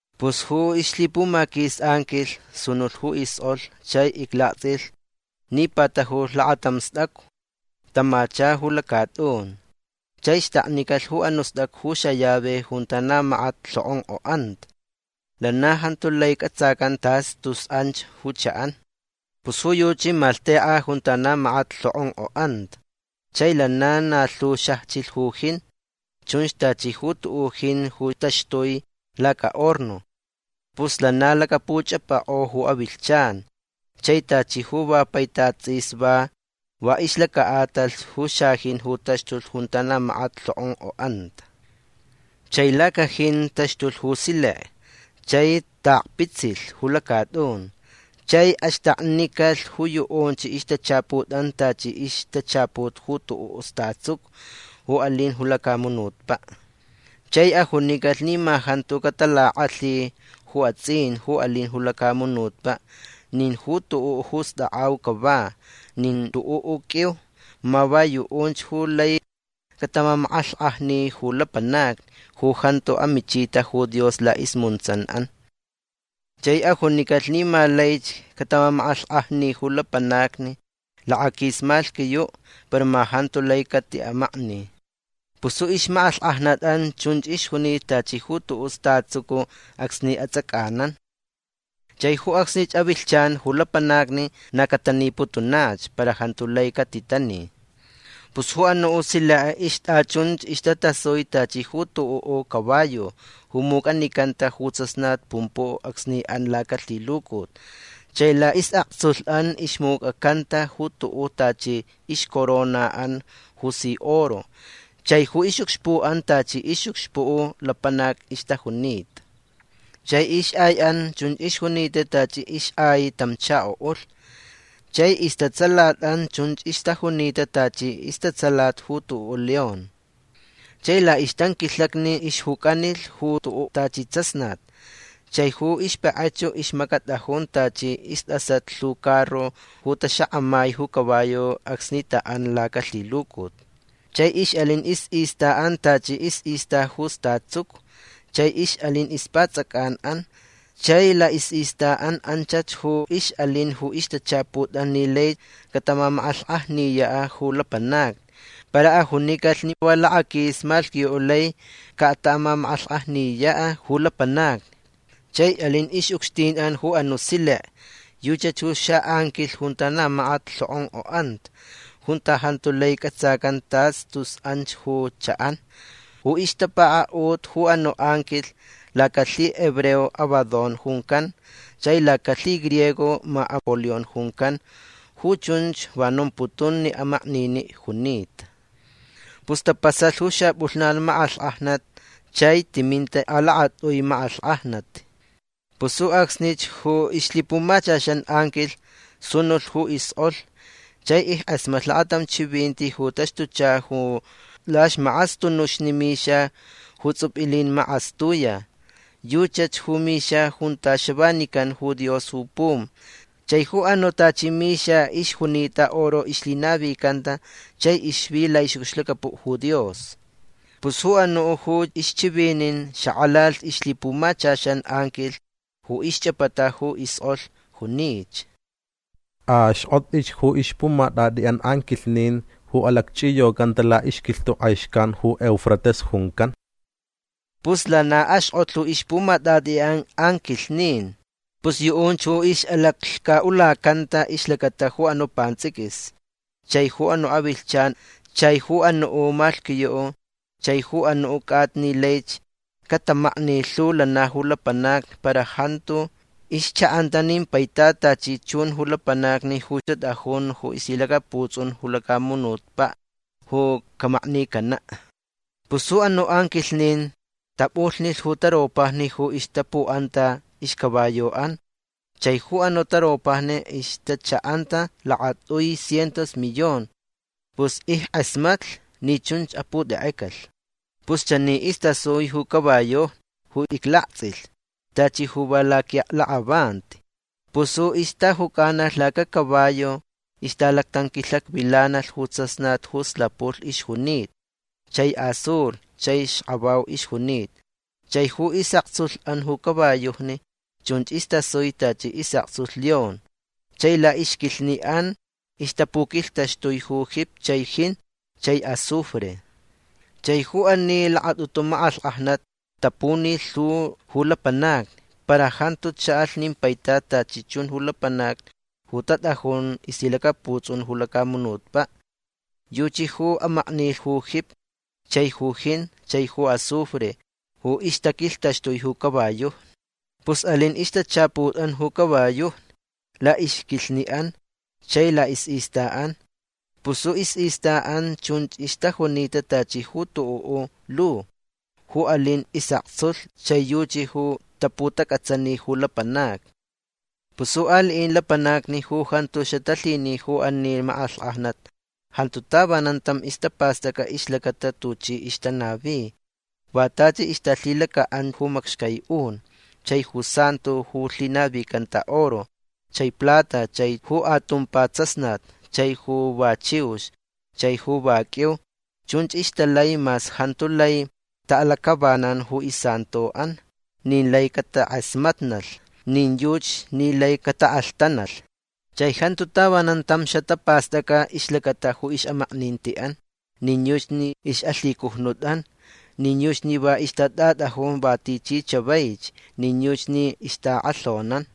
Pus ju ixlhipumaquis anquilh sunulh ju iskʼolh chai iclaktsʼilh ni patajulh lakatam stʼacu. Tamacha ju lacatʼun. Chai xtaknicalh ju anuʼ stʼacu ju xallave junta na makat lhokʼonkʼoʼanta. Lana jantu lai cʼatsacan tas tus anch ju chaʼan. Pus ju yuchi malhtekʼa junta na makat lhokʼonkʼoʼanta. Chai lana na lhu xajchilh ju jin. Chunch tachi ju tuʼuʼ jin ju taxtui lacahorno. Pus lana lakapuchʼapakʼo ju avilhchan. Chai tachi ju va paitat tsʼis va va ixlacaʼatalh ju xajin ju taxtulh junta na makat lhokʼonkʼoʼanta. Chai lacajin taxtulh ju silek. Chai taʼakpitsilh ju lacatʼun. Chai axtaknicalh ju yuʼunch ixtachaputʼan tachi ixtachaput ju tuʼuʼ statsucu ju alin ju lacamunutpaʼ. Chai ajunicalh ni ma jantu catalakʼalhi ju atsʼin ju alin ju lacamunutpaʼ nin ju tuʼuʼ ju stakʼau cava nin tuʼuʼ qʼuiu. Ma va yuʼunch ju lai catamamakʼalhkʼajni ju lapanacni ju jantu amichita ju Dios laʼismuntsanʼan. Chai ajunicalh ni ma laich cataʼamamakʼalhkʼajni ju lapanacni lakaquis malhquiyuʼ. Para ma jantu lai catiʼamakni. Pus ju ixmakʼalhkʼajnatʼan chunch ixjunita tachi ju tuʼuʼ statsucu acsni atsʼacʼanan. Chai ju acsni avilhchan ju lapanacni na cataniputunach para jantu lai catitani. Pus ju anuʼ silek ixtʼachunch ixtatasui tachi ju tuʼuʼ caballo ju mucʼanicanta ju tsasnat pumpuʼ acsni an lacalhilucut. Chai laʼisʼaktsulhʼan ixmucʼacanta ju tuʼuʼ tachi ixcoronaʼan ju si oro. Chai ju ixʼucxpuʼan tachi ixʼucxpuʼ lapanac ixtajunita. Chai ixʼaiʼan chun ixjunita tachi ixʼai tam chakoʼulh. Chai istatsalatʼan chun ixtajunita tachi istatsalat ju tuʼuʼ león. Chai laʼixtanquilhakni ixjucʼanilh ju tuʼuʼ tachi tsasnat. Chai ju ixpakʼachu ixmacatʼajun tachi istʼasat lhu carro ju taxakʼamai ju caballo acsni taʼan lacalhilucut. Chai ixʼalin isʼistaʼan tachi isʼista ju statsucu chai ixʼalin ixpatsʼacʼanʼan. Chai laʼisʼistaʼan anchach ju ixʼalin ju ixtachaputʼan ni lai cataʼamamakʼalhkʼajniyaʼ ju lapanacni. Para ajunicalh ni va lakaquis malhquiyuʼ lai cataʼamamakʼalhkʼajniyaʼ ju lapanacni. Chai alin ixʼucxtinʼan ju anuʼ silek. Yuchi ju xaʼanquilh junta na makat lhokʼonkʼoʼanta. Junta jantu lai cʼatsacan tas tus anch ju chaʼan. Ju ixtapakaʼut ju anuʼ anquilh lacalhihebreo Abadón juncan. Chai lacalhigriego ma Apolión juncan. Ju chunch va nomputun ni amakniniʼ junita. Pus tapasalh ju xapʼulhnan makʼalhkʼajnat. Chai timinta alakatʼui makʼalhkʼajnat. Pus ju acsnich ju ixlhipumachaxan anquilh sunulh ju iskʼolh chai ickʼasmatlh lakatam chivinti ju taxtucha ju laxmakʼastunuxni mixa ju tsupilin makʼastuya. Yuchach ju mixa junta xavanican ju Dios ju pum. Chai ju anuʼ tachi mixa ixjunita oro ixlhimanicanta chai ixvi laʼixʼucxlacapuʼ ju Dios. Pus ju anuʼ ju ixchivinin xakʼalalh ixlhipumachaxan anquilh ju ixchʼapata ju iskʼolh. Junich: ―Axkʼotʼich ju ixpumatʼatʼiʼan anquilhnin ju alacchʼiyocanta laʼixquilhtuʼ kʼai xcan ju Eufrates juncan. Pus lana axkʼotlh ju ixpumatʼatʼiʼan anquilhnin. Pus yuʼunch ju ixʼalaclhcaʼulacanta ixlacata ju anuʼ pantsʼiquis chai ju anuʼ avilhchan chai ju anuʼ malhquiyuʼ chai ju anuʼ cʼata ni laich catamakni lhu lana ju lapanacni. Para jantu ixchaʼanta nin paitat tachi chun ju lapanacni ju tatʼajun ju ixlhilacaputsʼun ju lacamunutpaʼ ju camaknicanaʼ. Pus ju anuʼ anquilhnin tapʼulhnilh ju taropajni ju ixtapuʼanta ixcaballoʼan. Chai ju anuʼ taropajni ixtachaʼanta lakatʼui cientos millón. Pus ickʼasmatlh ni chunch aputekʼecalh. Pus chani istasui ju caballojni ju iclaktsʼilh tachi ju va laquinʼaklakʼavanti. Pus ju ixtajucʼanalh lacacaballo ixtalactanquilhakvilanalh ju tsasnat ju slapulh ixjunita. Chai azul chai xkavau ixjunita. Chai ju isʼaktsulhʼan ju caballojni chunch istasui tachi isʼaktsulh león. Chai laʼixquilhniʼan ixtapuquilhtaxtui ju jipi chai jin chai azufre. Chai ju ani lakatʼutu makʼalhkʼajnat tapunilh lhu ju lapanacni. Para jantu chaʼalh nin paitat tachi chun ju lapanacni ju tatʼajun ixlhilacaputsʼun ju lacamunutpaʼ. Yuchi ju amaknilh ju jipi chai ju jin chai ju azufre ju ixtaquilhtaxtui ju caballojni. Pus alin ixtachaputʼan ju caballojni laʼixquilhniʼan chai laʼisʼistaʼan. Pus ju isʼistaʼan chunch ixtajunita tachi ju tuʼuʼ lu ju alin isʼaktsulh chai yuchi ju taputacʼatsani ju lapanacni. Pus ju aliʼin lapanacni ju jantu xatalhini ju ani makʼalhkʼajnat jantu tavanan tam ixtapastʼacʼa ixlacata tuchi ixtanavi. Va tachi ixtalhilacaʼan ju macxcai un chai ju santo ju lhinavicanta oro chai plata chai ju atumpa tsasnat chai ju va chiux chai ju va qʼuiu. Chunch ixtalai mas jantu lai taʼalacʼavanan ju isantoʼan nin lai catakʼasmatnalh nin yuchi ni lai cataʼalhtanalh. Chai jantu tavanan tam xatapastʼacʼa ixlacata ju ixʼamaknintiʼan nin yuchi ni ixʼalhicujnutʼan nin yuchi ni va ixtatʼatʼajun va tichi chavaich nin yuchi ni ixtaʼakʼalhonan.